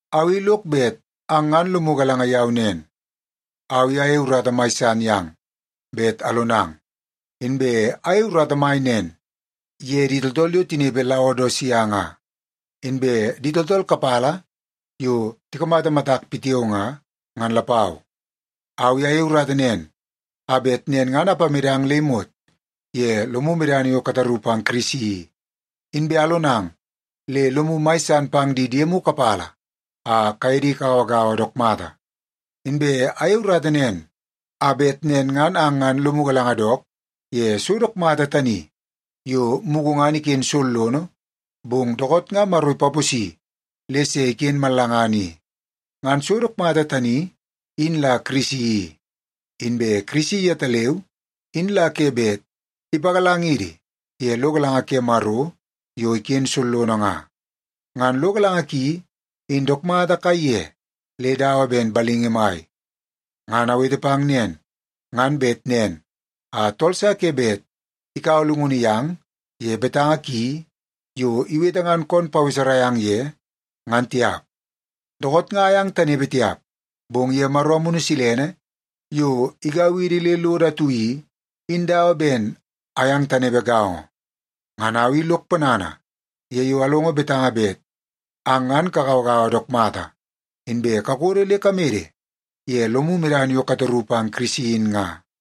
Au i lok bet ang ngan lomu galanga yau nen, au i ayei urata mai san yang bet alonang. Inbe ayei urata mai nen ye di tooltool yo tinepe Laodisia nga, inbe di tooltool kapala yo tikamata matak pitiao nga, ngan lapau. Au i ayei urata nen a bet nen ngan apamedang le imot ye lomu medana yo kataru pang Kirisi i, inbe alonang le lomu mai san pang di diemu kapala a kaye di kagauagaua dook mata. Inbe ayei urata nen a bet nen ngan ang ngan lomu galanga dook ye so dook mata tani yo mugu ngan iken sollono, bong dookoot nga Maro ipaposi le se iken mallangana i. Ngan so dook mata tani, in la Kirisi i. Inbe Kirisi yetaleu in la ke bet ipagalangidi ye lo galanga ke Maro yo iken sollono nga. Ngan lo galanga ki, in dook mata kaiye le dawa ben balingi mai. Ngan awete pang nen nga, ngan bet nen a tool sa ke bet ikaua llungunu yang ye betanga ki yo iwete ngan kon paweserai ang ye, ngan tiap. Dookoot nga ayang tanepe tiap, bong ye Maro Amunu Silene yo igau idi le lodo atu i, in dawa ben ayang tanepe gaongo. Ngan au i lok ponana ye yo alongo betanga bet ang ngan kagauagaua dook mata, inbe kakodo le kamede ye lomu medana yo kataru pang Kirisi in nga.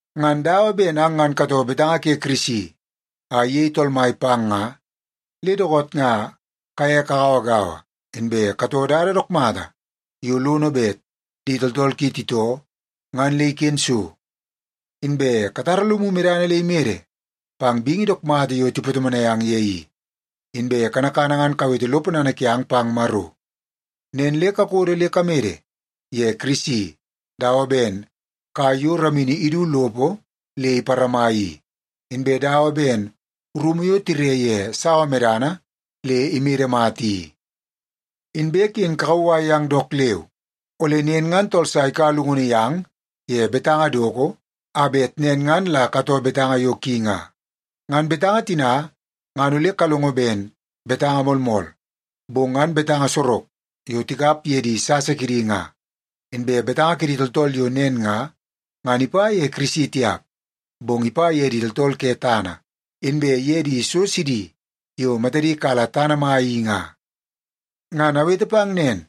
Ngan dawa ben ang ngan katoo betanga ke Kirisi a iyei Tool Mai pang nga, le dookoot nga kaye kagauagaua, inbe katoo dada dook mata yo lono bet di tooltool ki titoo ngan le iken so. Inbe katara lomu medana le imede pang bingi dook mata yo tipatomonai ang ye i, inbe kanakana ngan kawete lo ponana kiang pang Maro. Nen le kakodo le kamede ye Kirisi dawa ben kai yo ramini idu lopo le iparama i, inbe dawa ben rumu yo tire ye sawa medana le imede mata i. Inbe ken kakauwai yang dook leu, ole nen ngan tool sa ikaua llungunu yang ye betanga doko a bet nen ngan la katoo betanga yo ki nga. Ngan betanga tina ngan ole kalongo ben betanga moolmool, bong ngan betanga sorok yo tikap ye di sasa kidi nga. Inbe betanga ke di tooltool yo nen nga, ngan ipa ye Kirisi tiap, bong ipa ye di tooltool ke tana, inbe ye di so sidi yo matadi kala tana mai i nga. Ngan awete pang nen,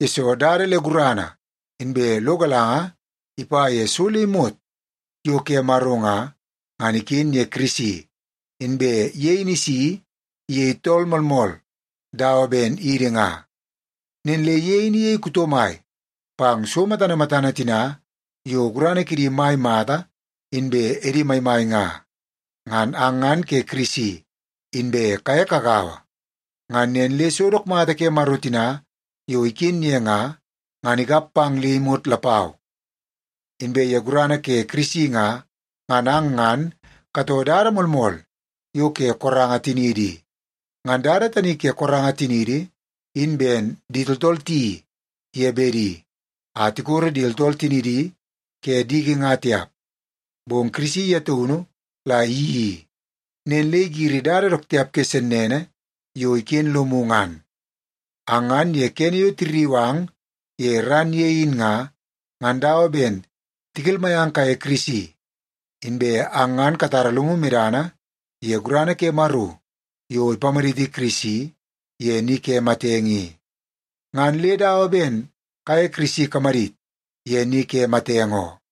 yesoo dada le gurana inbe lo galanga ipa ye so le imot yo ke Maro nga, ngan iken ye Kirisi, inbe ye in isi iyei tool moolmool dawa ben idi nga. Nen le ye in iyei kuto mai pang so matana matana tina yo gurana kidi mai mata inbe edi maimai nga. Ngan ang ngan ke Kirisi, inbe kaye kagaua. Ngan nen le so dook mata ke Maro tina yo iken ye nga, ngan ikap pang le imot lapau. Inbe ye gurana ke Kirisi nga, ngan ang ngan katoo dada moolmool yo ke koranga tiniidi i. Ngan dada tani ke koranga tiniidi in ben di tooltool tiyeii ye bedi a tikoro di tooltool tinidi ke diki nga tiap, bong Kirisi ye taunu la iyeii i, nen le igiri dada dook tiap ke sennene yo iken lomu ngan. Ang ngan ye kene yo tirriu ang ye ran ye in nga, ngan dawa ben tikelmai ang kaye Kirisi. Inbe ang ngan katara lomu medana ye gurana ke Maro yo ipamaditi Kirisi ye ni ke matenge i, ngan le dawa ben kaye Kirisi kamadit ye ni ke matenge oo.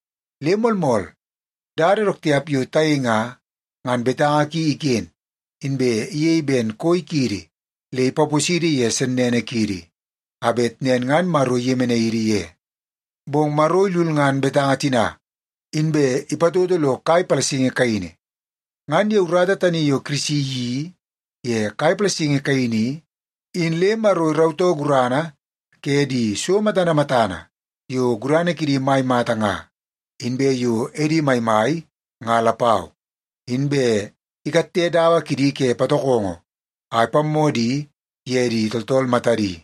Le moolmool, dada dook tiap yo tayei nga, ngan betanga ki iken, inbe iyei ben koi kiidi le ipaposidi ye sennene kiidi, a bet nen ngan Maro iyemenai idi ye. Bong Maro ilulngan betanga tina, inbe ipatoto lo kai palasingi kaini. Ngan ye urata tani yo Kirisi iyeii ye kai palasingi kaini i, in le Maro irautoo gurana ke di so matana matana yo gurana kidi mai mata nga, inbe yo edi maimai nga lapau. Inbe ikatte dawa kidi ke patokongo a ipammoo di ye di tooltool matadi.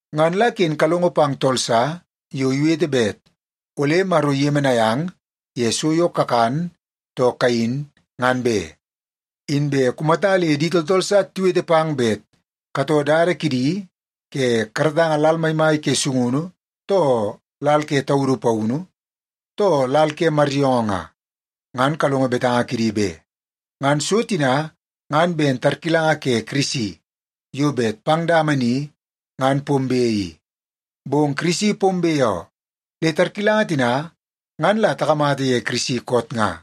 Ngan la ken kalongo pang tool sa yo iwete bet ole Maro iyemenai ang ye so yo kakan too kayin, ngan be. Inbe kumata le di tooltool sa tiwete pang bet katoo dada kidi ye kamatanga lal maimai ke sungunu, too lal ke taudu paunu, too lal ke maryoongoo nga, ngan kalongo betanga kidi be. Ngan so tina ngan ben tarkilanga ke Kirisi yo bet pang dama ni ngan pombe i. Bong Kirisi pombe oo, le tarkilanga tina ngan la takamata ye Kirisi koot nga.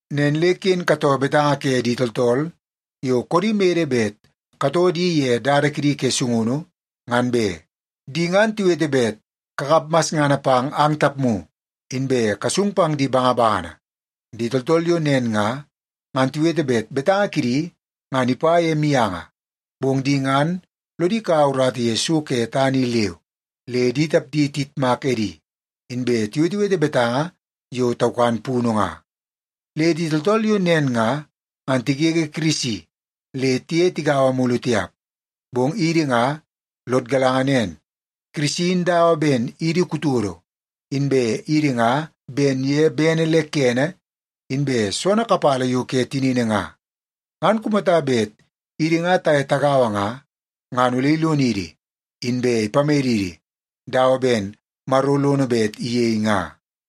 Nen le ken katoo betanga ke di tooltool yo koodi mede bet katoo di ye dada kidi ke sungunu, ngan be. Di ngan tiwete bet kakap masngana pang ang tapmu, inbe kasung pang di bangabangana. Di tooltool yo nen nga, ngan tiwete bet betanga kidi ngan ipa ye mianga, bong di ngan lodi kaua urata ye so ke tana i leu, le di tapdi tiyitmak edi, inbe tiwetewete betanga yo taukan punu nga. Le di tooltool yo nen nga, ngan tigege Kirisi le tiye tigaua mulu tiap. Bong idi nga lod galanga nen, Kirisi in dawa ben idi kutodo, inbe idi nga ben ye bene le kene inbe soonoo kapala yo iken ye tinini nga. Ngan kumata bet idi nga taye tagaua nga, ngan ole ilonidi, inbe ipamedidi dawa ben Maro lono bet iyei nga.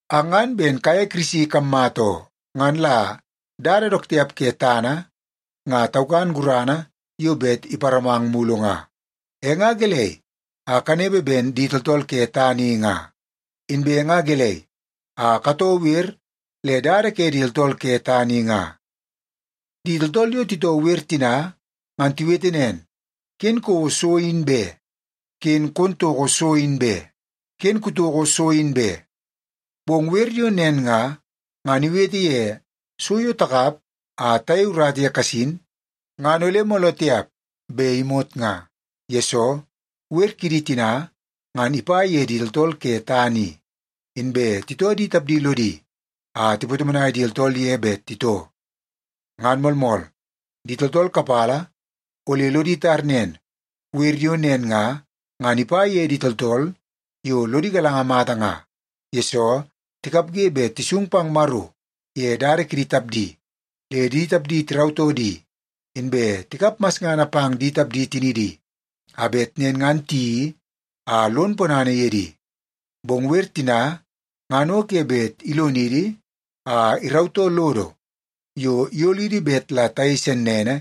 Ang ngan ben kaye Kirisi kammata oo. Ngan la dada dook tiap ke tana nga taukan gurana yo bet iparamang mulu nga. E nga gelei a kanepe ben di tooltool ke tana i nga? Inbe nga gelei a katoo wer le dada ke di tooltool ke tana i nga? Di tooltool yo titoo wer tina, ngan tiwete nen, “Ken kouo so in be! Ken kon toko so in be! Ken kutoko so in be!” Bong wer yo nen nga, ngan iwete ye so yo takap a tayei urata ye kasin, ngan ole mooloo tiap be imot nga. Yesoo, wer kidi tina, ngan ipa ye di tooltool ke tana i, inbe titoo di tapdi lodi a tipatomonai di tooltool ye bet titoo. Ngan moolmool, di tooltool kapala ole lodi tar nen, wer yo nen nga, ngan ipa ye di tooltool yo lodi galanga mata nga, yesoo tikapge bet tisung pang Maro ye dada kidi tapdi, le di tapdi tirautoo di, inbe tikap masngana pang di tapdi tinidi, a bet nen ngan tiyeii a lon ponana ye di. Bong wer tina ngan o ke bet ilonidi a irautoo lodo yo iyolidi bet la tayei sennene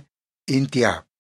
in tiap.